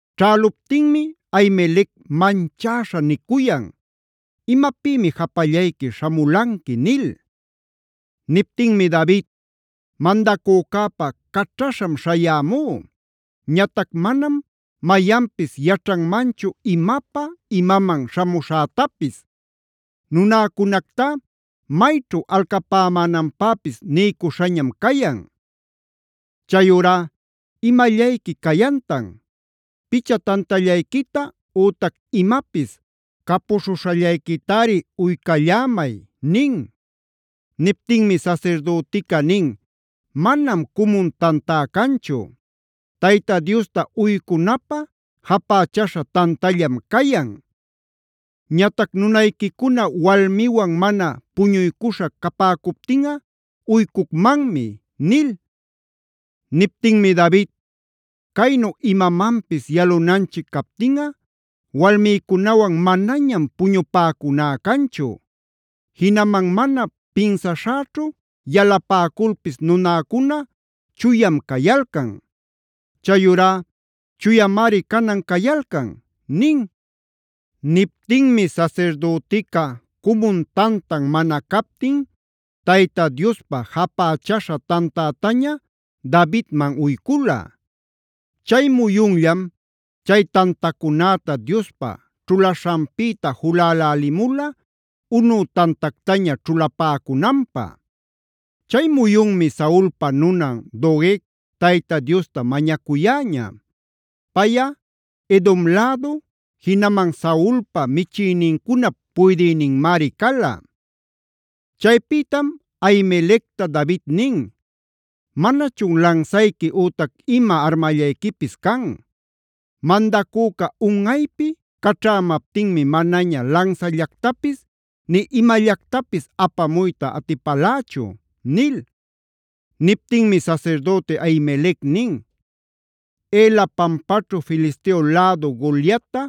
Ćhäluptinmi Ahimelec manchäśha nicuyan: “¿Imapïmi japallayqui śhamulanqui?” nil. Niptinmi David: “Mandacücäpa caćhaśham śhayämú. Ñatac manam mayanpis yaćhanmanchu imapä imaman śhamuśhätapis. Nunäcunactá mayćhu alcapämänanpäpis niycuśhañam cayan. Chayurá ¿imallayqui cayantan? Picha tantallayquita ütac imapis capuśhuśhallayquitari uycallämay” nin. Niptinmi sasirdütica nin: “Manam cumun tantá canchu. Tayta Diosta uycunapä japächaśha tantallam cayan. Ñatac nunayquicuna walmiwan mana puñuycuśha capäcuptinꞌa uycucmanmi” nil. Niptinmi David: “Caynu imamanpis yalunanchic captinꞌa walmïcunawan manañam puñupäcuná canchu. Jinaman mana pinsaśhäćhu yalapäculpis nunäcuna chuyam cayalcan. Chayurá chuyamari canan cayalcan” nin. Niptinmi sasirdütica cumun tantan mana captin Tayta Diospäjapächaśha tantätañab Davidman uycula. Chay muyunllam chay tantacunäta Diospä ćhulaśhanpïta julälälimula, unü tantactaña ćhulapäcunanpä. Chay muyunmi Saulpa nunan Doeg Tayta Diosta mañacuyäña. Payꞌa Edom lädu, jinaman Saulpa michïnincunap puydïninmari cala. Chaypïtam Ahimelecta David nin: “¿Manachun lansayqui ütac ima armallayquipis can? Mandacüca unꞌaypi caćhämaptinmi manaña lansallactapis nï imallactapis apamuyta atipalächu” nil. Niptinmi sasirdüti Ahimelec nin: “Ela pampaćhu Filisteo lädu Goliatta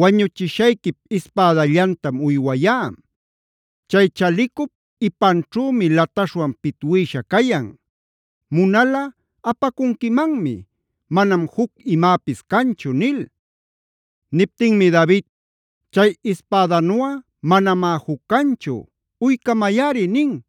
wañuchishayquip ispädallantam uywayá.c Chay chalicup ipanćhümi lataśhwan pitwïsha cayan. Munalꞌa apacunquimanmi, manam juc imäpis canchu” nil. Niptinmi David: “Chay ispädanuꞌa manamá juc canchu; uycamayꞌari” nin.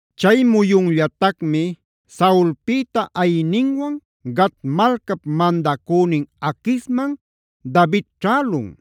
Chay muyunllatacmi Saulpïta ayïninwan Gat malcap mandacünin Aquisman David ćhälun.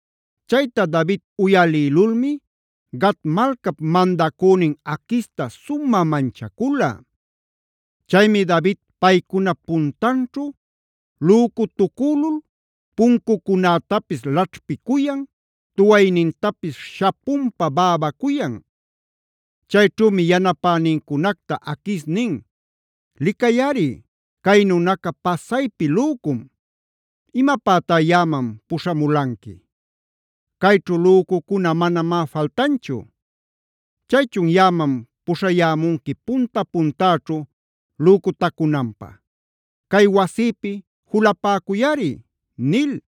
Chayta David uyalïlulmi Gat malcap mandacünin Aquista sumä manchacula.e Chaymi David paycunap puntanćhu lücutucülulf puncucunätapis laćhpicuyan, tuwaynintapis shapunpa bäbacuyan. Chayćhümi yanapänincunacta Aquis nin: “Licayꞌari cay nunaca pasaypi lücum. ¿Imapätá yaꞌaman puśhamulanqui? Cayćhu lücucuna manamá faltanchu. ¿Chaychun yaꞌaman puśhayämunqui punta-puntäćhu lücutacunanpä? Cay wasïpi julapäcuyꞌari” nil.